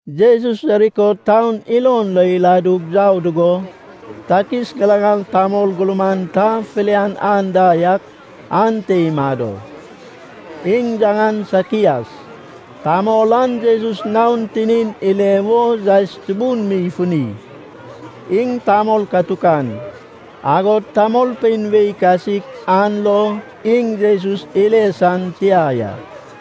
Jesus Jeriko taun ilon lo iladug yau dugo, takis ŋilaŋal tamol gurman ta filian anda yak ante imado. Iŋ yaŋan Sakias. Tamol an Jesus naon tinin ile wo yaes tubun mi ifuni. Iŋ tamol katukan, agod tamolpein wei kasik an lo iŋ Jesus ile san tia ya.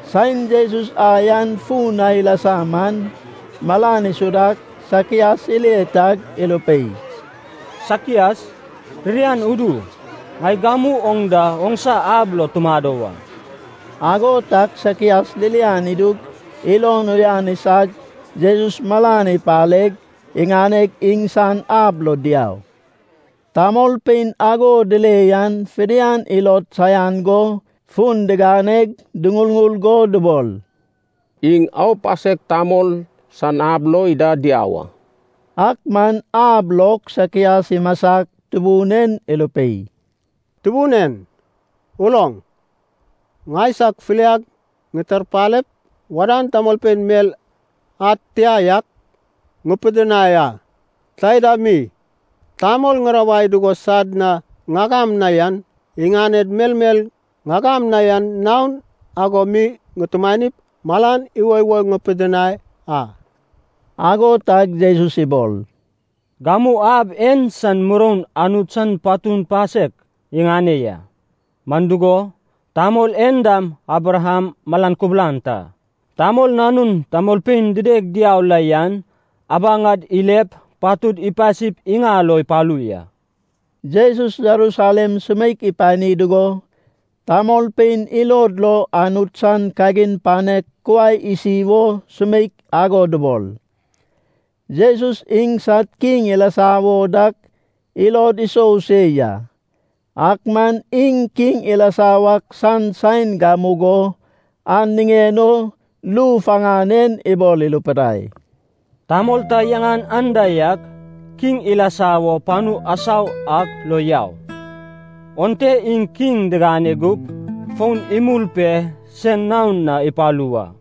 Saen Jesus ai an fun na ilasa man, malan isudag Sakias ile tag irupei, “Sakias, ririan udu. Ŋai gamu oŋ da oŋsa ab lo tumado wa.” Ago tag Sakias ririan idug ilon uyan isag Jesus malan ipareg, iŋaneg iŋsan ab lo diau. Tamolpein ago dile yan fidian ilod saian go fun diganeg duŋurŋur go dubol, “Iŋ aupasek tamol san ab lo ida diau a.” Ak man ab log Sakias imasag Tubun en irupei, “Tubun en, uloŋ. Ŋaisag filiag ŋitarpalep, wadan tamolpein mel ad tia yak ŋupidinai a. Taida mi, tamol ŋirawai dugo sad na ŋagam na yan, iŋaned melmel ŋagam na yan naon ago mi ŋutumanip, malan iwoiwo ŋupidinai a.” Ago tag Jesus ibol, “Gamu ab en san muroun Anut san patu pasek iŋane ya. Man dugo, tamol en dam Abraham malan kubulan ta. Tamol Nanun tamolpein dideg diau la yan abaŋad ilep patud ipasip iŋal o ipalu ya.” Jesus Jerusalem sumeik ipani dugo, tamolpein ilod lo Anut san kagin panek kuai isi wo sumeik ago dubol. Jesus iŋsad kiŋ ilasa wo dak ilod isou se ya, ak man iŋ kiŋ ilasa wak san saen gamugo an niŋen o ru faŋan en ibol irupidai, “Tamol ta yaŋan anda yak kiŋ ilasa wo panu asau ak lo yau. Onte iŋ kiŋ digane gup fon imul pe sen naon na ipalu wa.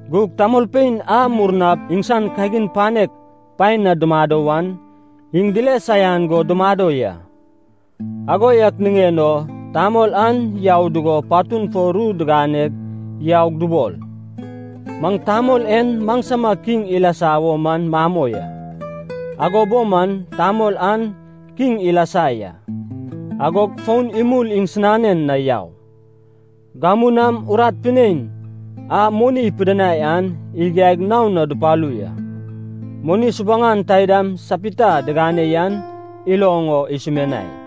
“Gug tamolpein a murnap iŋsan kagin panek paen na dumado wan, iŋ dile saian go dumado ya. Ago yak niŋen o tamol an yau dugo patun fo ru digane yaug dubol, ‘Maŋ tamol en maŋsama kiŋ ilasa wo man mamoi a.’ “Ago bo man tamol an kiŋ ilasa ya, agog fon imul iŋsinanen na yau. Gamu nam urat pinein a moni ipidinai an igiaig naon na dupalu ya. Moni subuŋan taidam sapita diŋane yan iloŋ o isumianai.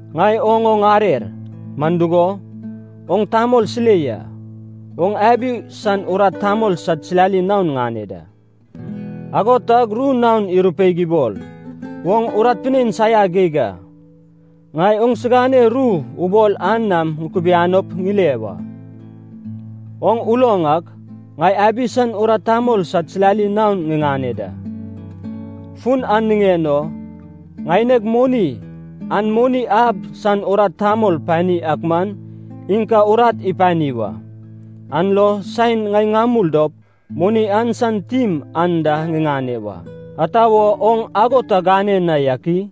Ŋai oŋ o ŋarer. Man dugo, oŋ tamol silei a. Oŋ abi san urat tamol sad silali naon ŋane da.’ “Ago tag ru naon irupeig ibol, ‘Oŋ urat pinein saia geig a. Ŋai oŋsigane ru ubol an nam ŋukubianop ŋile wa. Oŋ uloŋ ak, ŋai abi san urat tamol sad silali naon ŋiŋane da. Fun an niŋen o ŋaineg moni an moni ab san urat tamol pani ak man, iŋ ka urat ipani wa, an lo saen ŋai ŋamul dop moni an san tim an da ŋiŋane wa. Ata wo oŋ ago ta gane na yak i?’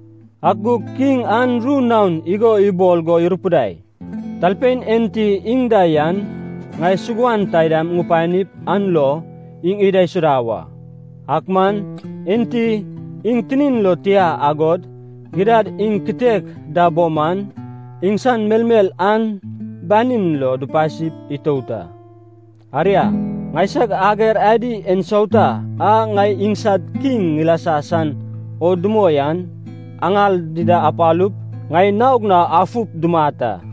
“Ak gug kiŋ an ru naon igo ibol go irupidai, ‘Talpein enti iŋ da yan, ŋai suguan taidam ŋupanip an lo iŋ idaisuda wa. Ak man, enti iŋ tinin lo tia agod, gidad iŋ kitek da bo man, iŋsan melmel an banin lo dupasi itout a. Aria, ŋaisag ager adi ensauta a ŋai iŋsad kiŋ ŋilasa san o dumoi an, aŋal dida apalup, ŋai naog na afup dumat a.’”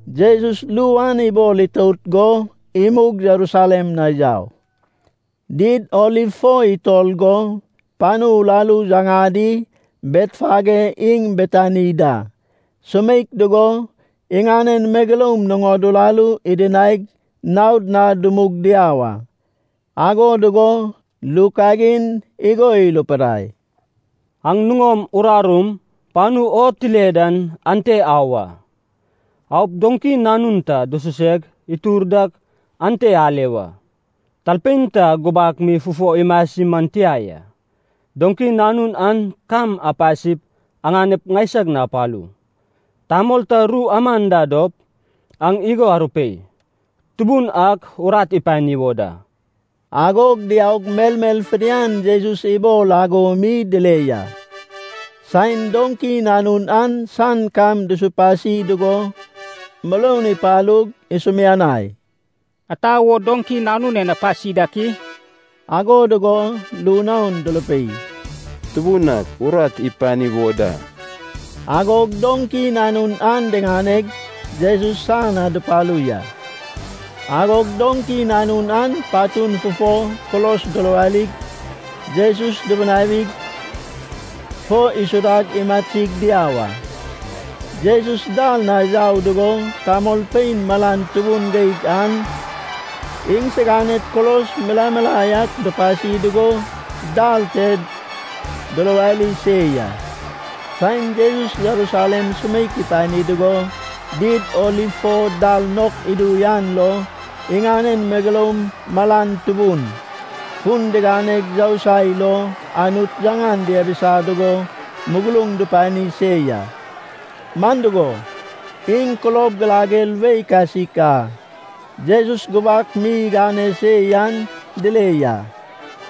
Jesus ru an ibol itout go imug Jerusalem na yau. Did Oliv fo itor go panu uraru yaŋadi Betfage iŋ Betani da sumeik dugo, iŋanen megeloum nuŋod urarum idinaig naon na dumug diau a. Ago dugo ru kagin igo irupidai, “Aŋ nuŋom urarum panu o tile dan ante au a. Aup doŋki nanun ta dususeg itur dak ante ale wa, talpein ta gubak mi fufo imasi man tia ya. Doŋki nanun an kam apasip aŋanep ŋaisag na apalu. Tamol ta ru aman da dop, aŋ igo arupei, ‘Tubun ak urat ipani wo da.’” Agog diaug melmel fidian Jesus ibol ago mi dile ya. Saen doŋki nanun an san kam dusupasi dugo, muroun ipalug isumianai, “Ata wo doŋki nanun en apasi dak i?” Ago dugo ru naon durupei, “Tubun ak urat ipani wo da.” Agog doŋki nanun an diŋaneg, Jesus san na dupalu ya. Agog doŋki nanun an patun fufo kulos duruwarig, Jesus dubunawig fo isudag imasig diau a. Jesus dal na yau dugo tamolpein malan tubun geig an iŋsiganed kulos milae milae ak dupasi dugo dal te duruwari se ya. Saen Jesus Jerusalem sumeik ipani dugo Did Oliv fo dal nok idu an lo iŋanen megeloum malan tubun, fun diganeg yousai lo Anut yaŋan diabisa dugo muguruŋ dupani se ya. Man dugo, iŋ kulob girager wei kasik a Jesus gubak mi igane se yan dile ya.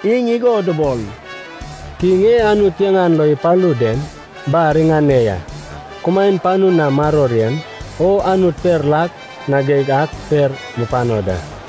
Iŋ igo dubol, “Kiŋ e Anut yaŋan lo ipalu den bar iŋane ya! Kumaen panu na maror yen. O Anut per lak na geig ak per mupano da!”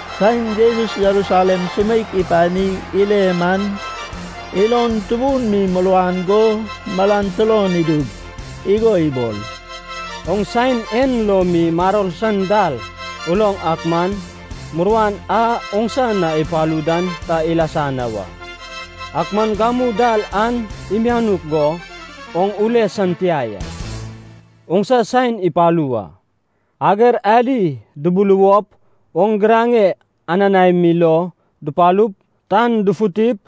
Saen Jesus Jerusalem sumeik ipanig ile man, ilon tubun mi muruan go malan turon idug, igo ibol, “Oŋ saen en lo mi maror san dal uloŋ ak man, muruan a oŋsa na ipalu dan ta ilasa na wa. Ak man gamu dal an imianuk go oŋ ule san tia ya. Oŋsa saen ipalu wa. Ager adi dubuluwop oŋ giraŋe ananae mi lo dupalup, tan dufutip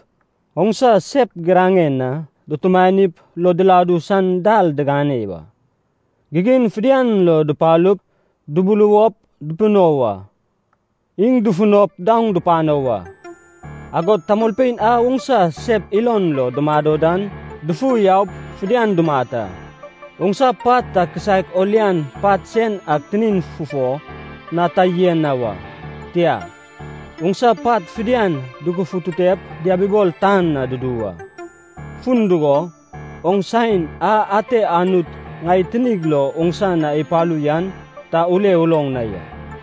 oŋsa sep giraŋen na dutumanip lo diladu san dal digane wa. Gigin fidian lo dupalup dubuluwop dupino wa. Iŋ dufunop daoŋ dupano wa, agod tamolpein a oŋsa sep ilon lo dumado dan dufu yaup fidian dumat a. Oŋsa pat ta kisaek o lian pat sen ak tinin fufo na ta yen na wa, tia, oŋsa pat fidian dugufututep diabibol tan na dudu wa. Fun dugo, oŋ saen a ate Anut ŋai tinig lo oŋsa na ipalu yan ta ule uloŋ na ya.”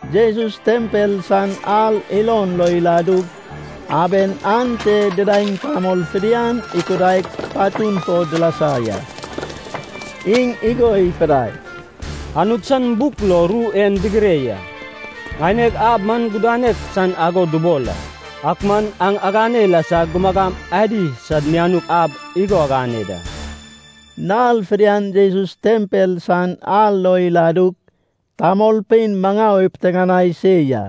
Jesus tempel san ar ilon lo iladug, aben ante didaeŋ tamol fidian ikudaig patun fo dilasa ya. Iŋ igo ipidai, “Anut san buk lo ru en digire ya, ‘Ŋaineg ab man gudanek san ago dubol a,’ ak man aŋ agane ilasag ‘gumagam adi sad mianuk ab’ igo agane da.” Nal fidian Jesus tempel san ar lo iladug tamolpein maŋau ipiteŋanai se ya.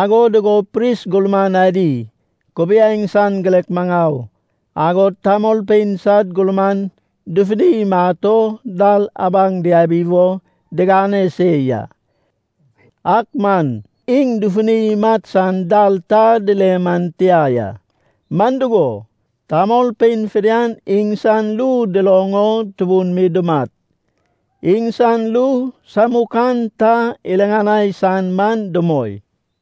Ago dugo pris gurman adi, kubiaeŋ san girek maŋau, agod tamolpein sad gurman dufuni imat o dal abaŋ diabi wo digane se ya. Ak man iŋ dufuni imat san dal ta dile man tia ya. Man dugo, tamolpein fidian iŋsan ru duloŋ o tubun mi dumat. Iŋsan ru samukan ta iriŋanai san man dumoi.